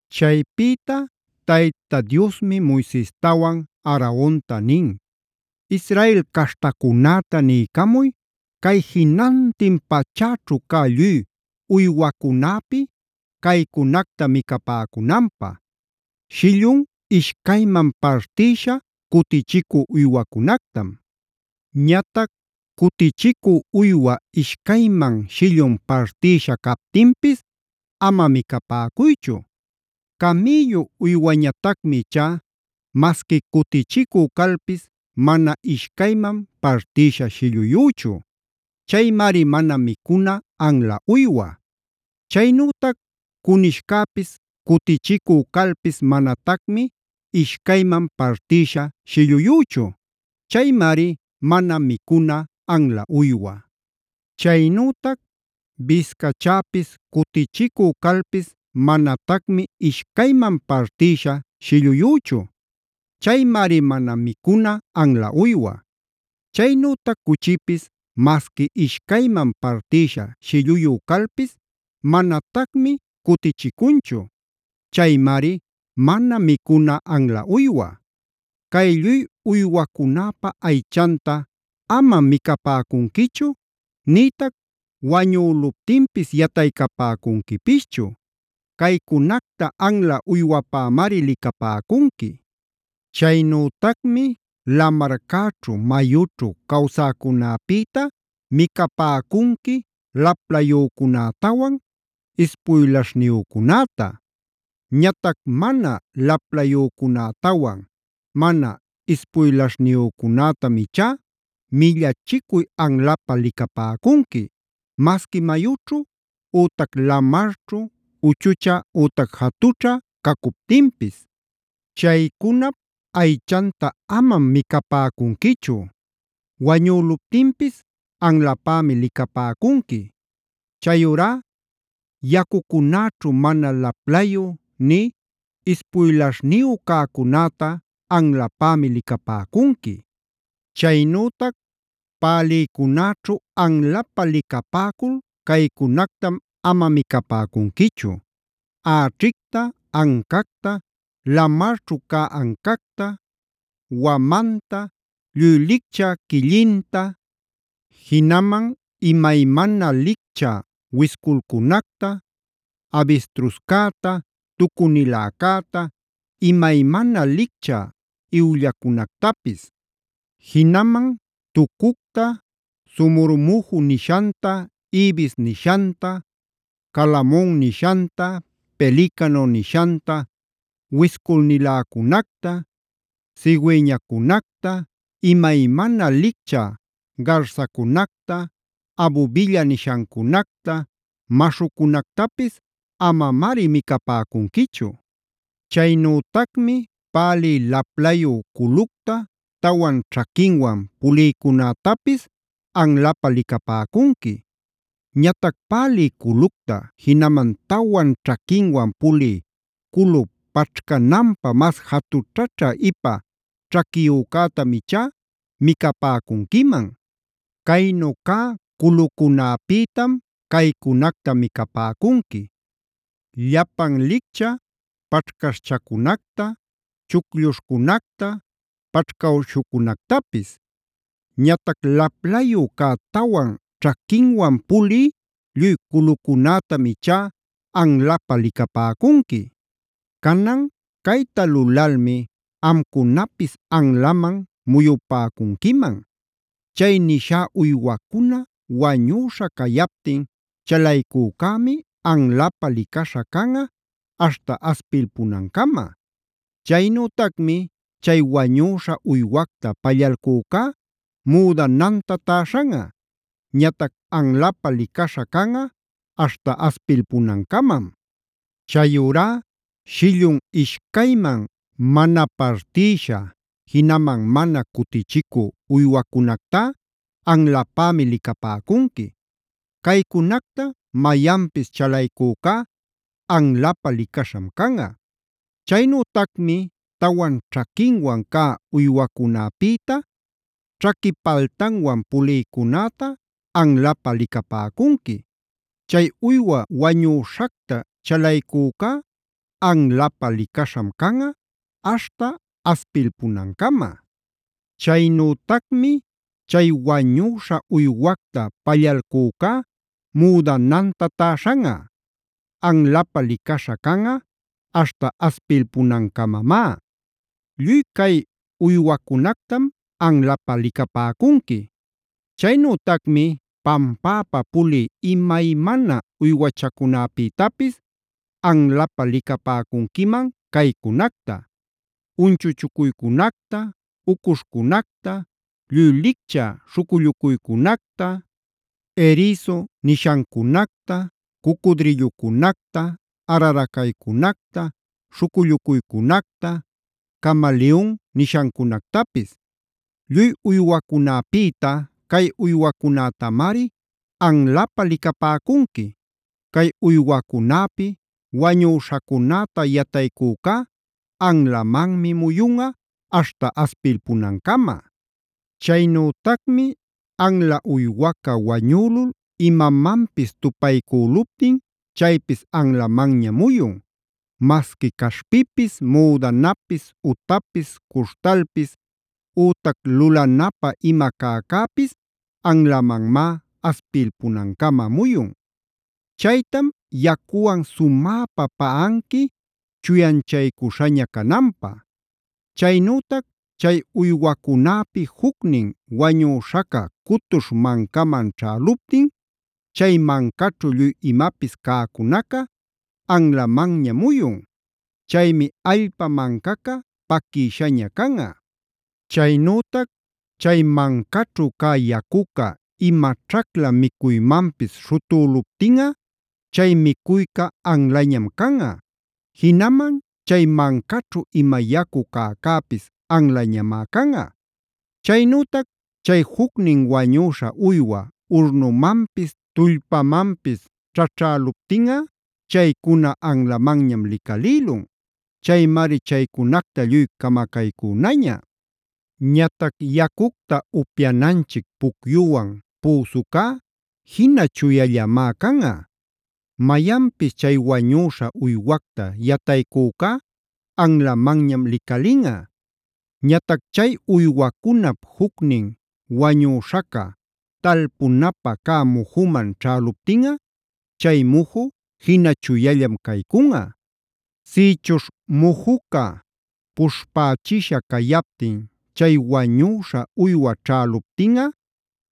Chaypïta Tayta Diosmi Moisestawan Aaronta nin: “Israel caśhtacunäta niycamuy cay jinantin pachäćhu cä lluy uywacunäpi caycunacta micapäcunanpä: Shillun ishcayman partïsha cutichicü uywacunactam. Ñatac cutichicü uywa ishcayman shillun partïsha captinpis ama micapäcuychu. Camïllu uywañatacmi ichá masqui cutichicü calpis mana ishcayman partïsha shilluyüchu. Chaymari mana micuna anla uywa. Chaynütac cunishcäpis cutichicu calpis manatacmi ishcayman partïsha shilluyüchu. Chaymari mana micuna anla uywa. Chaynütac biscachäpis cutichicü calpis manatacmi ishcayman partïsha shilluyüchu. Chaymari mana micuna anla uywa. Chaynütac cuchipis masqui ishcayman partïsha shilluyu calpis manatacmi cutichicunchu. Chaymari mana micuna anla uywa. Cay lluy uywacunäpa aychanta amam micapäcunquichu, nïtac wañüluptinpis yataycapäcuquipischu. Caycunacta anla uywapämari licapäcunqui. “Chaynütacmi lamarcäćhu, mayućhu cawsäcunäpïta micapäcunqui laplayücunätawan ispuylaśhniyücunäta. Ñatac mana laplayücunätawan mana ispuylaśhniyücunätam ichá millachicuy anlapä licapäcunqui, masqui mayućhu ütac lamarćhu uchuchä ütac jatućha cacuptinpis. Chaycunap aychanta amam micapäcunquichu; wañüluptinpis anlapämi licapäcunqui. Chayurá yacucunäćhu mana laplayü nï ispuylaśhniyu cäcunäta anlapämi licapäcunqui. “Chaynütac pälïcunäćhu anlapä licapäcul caycunactam ama micapäcunquichu: äćhicta, ancacta, lamarćhu cä ancacta, wamanta, lluy lichcä quillinta, jinaman imaymana licchä wisculcunacta, abistruscäta, tucuniläcäta, imaymana licchä iwllacunactapis. Jinaman tucucta, somormuju nishanta, ibis nishanta, calamon nishanta, pelicano nishanta, wisculniläcunacta, cigüeñacunacta, imaymana licchä garsacunacta, abubilla nishancunacta, maśhucunactapis amamari micapäcunquichu. “Chaynütacmi pälï laplayü culucta, tawan ćhaquinwan pulïcunätapis anlapä licapäcunqui. Ñatac pälï culucta, jinaman tawan ćhaquinwan pulï culu paćhcananpä mas jatućhaćhä ipa ćhaquiyücätam ichá micapäcunquiman. Caynu cä culucunäpïtam caycunacta micapäcunqui: llapan lichcä paćhcaśhchacunacta, chuclluśhcunacta, paćhcawśhucunactapis. Ñatac laplayu cä tawan ćhaquinwan pulï lluy culucunätam ichá anlapä licapäcunqui. “Canan cayta lulalmi amcunapis anlaman muyupäcunquiman: Chay nishá uywacuna wañüśha cayaptin chalaycücämi anlapä licaśha canꞌa aśhta aspilpunancama. “Chaynütacmi chay wañüśha uywacta pallalcücá müdananta täśhanꞌa. Ñatac anlapä licaśha canꞌa aśhta aspilpunancamam. “Chayurá shillun ishcayman mana partïsha, jinaman mana cutichicü uywacunactá anlapämi licapäcunqui. Caycunacta mayanpis chalaycücá anlapä licaśham canꞌa. “Chaynütacmi tawan ćhaquinwan cä uywacunäpïta ćhaqui paltanwan pulïcunäta anlapä licapäcunqui. Chay uywa wañüśhacta chalaycücá anlapä licaśham canꞌa aśhta aspilpunancama. Chaynütacmi chay wañüśha uywacta pallalcücá müdananta täśhanꞌa. Anlapä licaśha canꞌa aśhta aspilpunancamamá. Lluy cay uywacunactam anlapä licapäcunqui. “Chaynütacmi pampäpa pulï imaymana uywachacunapïtapis anlapä licapäcunquiman caycunacta: Unchuchucuycunacta, ucuśhcunacta, lluy licchä śhucullucuycunacta, erisu nishancunacta, cucudrillucunacta, araracaycunacta, śhucullucuycunacta, camaliyun nishancunactapis. “Lluy uywacunäpïta cay uywacunätamari anlapä licapäcunqui. Cay uywacunäpi wañüśhacunäta yataycücá anlamanmi muyunꞌa aśhta aspilpunancama. “Chaynütacmi anla uywaca wañülul imamanpis tupaycüluptin chaypis anlamanña muyun; masqui caśhpipis, müdanapis, utapis, cuśhtalpis, ütac lulanapä ima cäcäpis anlamanmá aspilpunancama muyun. Chaytam yacuwan sumäpä paꞌanqui chuyanchaycuśhaña cananpä. “Chaynütac chay uywacunäpi jucnin wañüśhaca cutuśh mancaman ćhäluptin, chay mancaćhu lluy imapis cäcunaca anlamanña muyun. Chaymi allpa mancaca paquishaña canꞌa. Chaynütac chay mancaćhu cä yacuca ima ćhacla micuymanpis śhutüluptinꞌa chay micuycä anlañam canꞌa. Jinaman chay mancaćhu ima yacu cäcäpis anlañamá canꞌa. Chaynütac chay jucnin wañüśha uywa urnumanpis, tullpamanpis ćhaćhäluptinꞌa chaycuna anlamanñam licalïlun. Chaymari chaycunacta lluy camacaycünaña. “Ñatac yacucta upyananchic pucyuwan püsucá jina chuyallamá canꞌa. Mayanpis chay wañüśha uywacta yataycücá anlamanñam licalinꞌa. “Ñatac chay uywacunap jucnin wañüśhaca talpunapä cä mujuman ćhäluptinꞌa chay muju jina chuyallam caycunꞌa. Sïchuśh mujuca puśhpächisha cayaptin chay wañüśha uywa ćhäluptinꞌa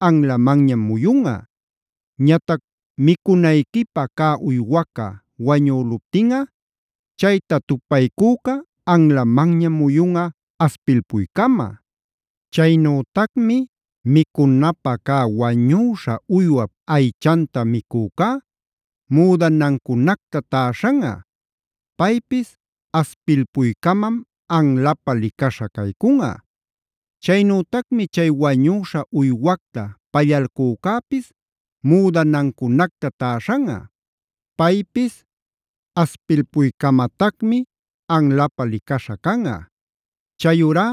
anlamanñam muyunꞌa. “Ñatac micunayquipä cä uywaca wañüluptinꞌa, chayta tupaycüca anlamanñam muyunꞌa aspilpuycama. Chaynütacmi micunapä cä wañüśha uywap aychanta micücá müdanancunacta täśhanꞌa; paypis aspilpuycamam anlapä licaśha caycunꞌa. Chaynütacmi chay wañüśha uywacta pallalcücäpis müdanancunacta täśhanꞌa; paypis aspilpuycamatacmi anlapä licaśha canꞌa. “Chayurá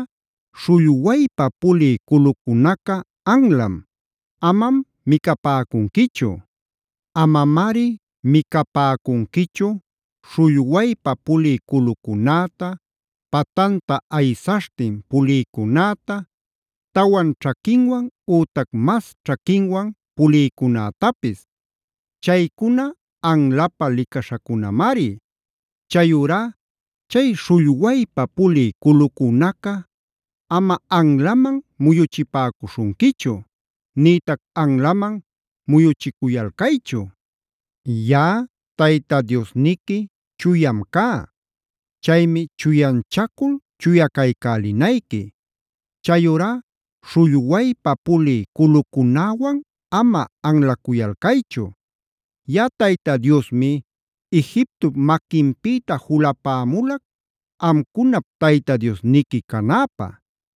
śhullwaypa pulï culucunaca anlam; amam micapäcunquichu. “Amamari micapäcunquichu śhullwaypa pulï culucunäta, patanta aysaśhtin pulïcunäta, tawan ćhaquinwan ütac mas ćhaquinwan pulïcunätapis. Chaycuna anlapä licaśhacunamari. Chayurá chay śhullwaypa pulï culucunaca ama anlaman muyuchipäcuśhunquichu; nïtac anlaman muyuchiculcaychu. Yaꞌa Tayta Diosniqui chuyam cá; chaymi chuyanchacul chuya caycälinayqui. Chayurá śhullwaypa pulï culucunäwan ama anlacuyalcaychu. Yaꞌa Tayta Diosmi Egiptop maquinpïta julapämulac amcunap Tayta Diosniqui canäpä.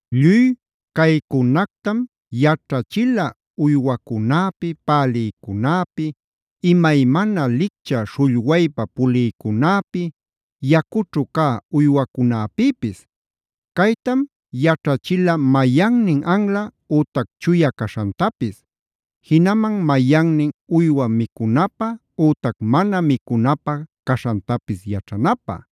Lluy caycunactam yaćhachila uywacunäpi, pälïcunäpi, imaymana liccha śhullwaypa pulïcunäpi, yacućhu cä uywacunapïpis. Caytam yaćhachila mayannin anla ütac chuya caśhantapis, jinaman mayannin uywa micunapä ütac mana micunapä caśhantapis yaćhanapä.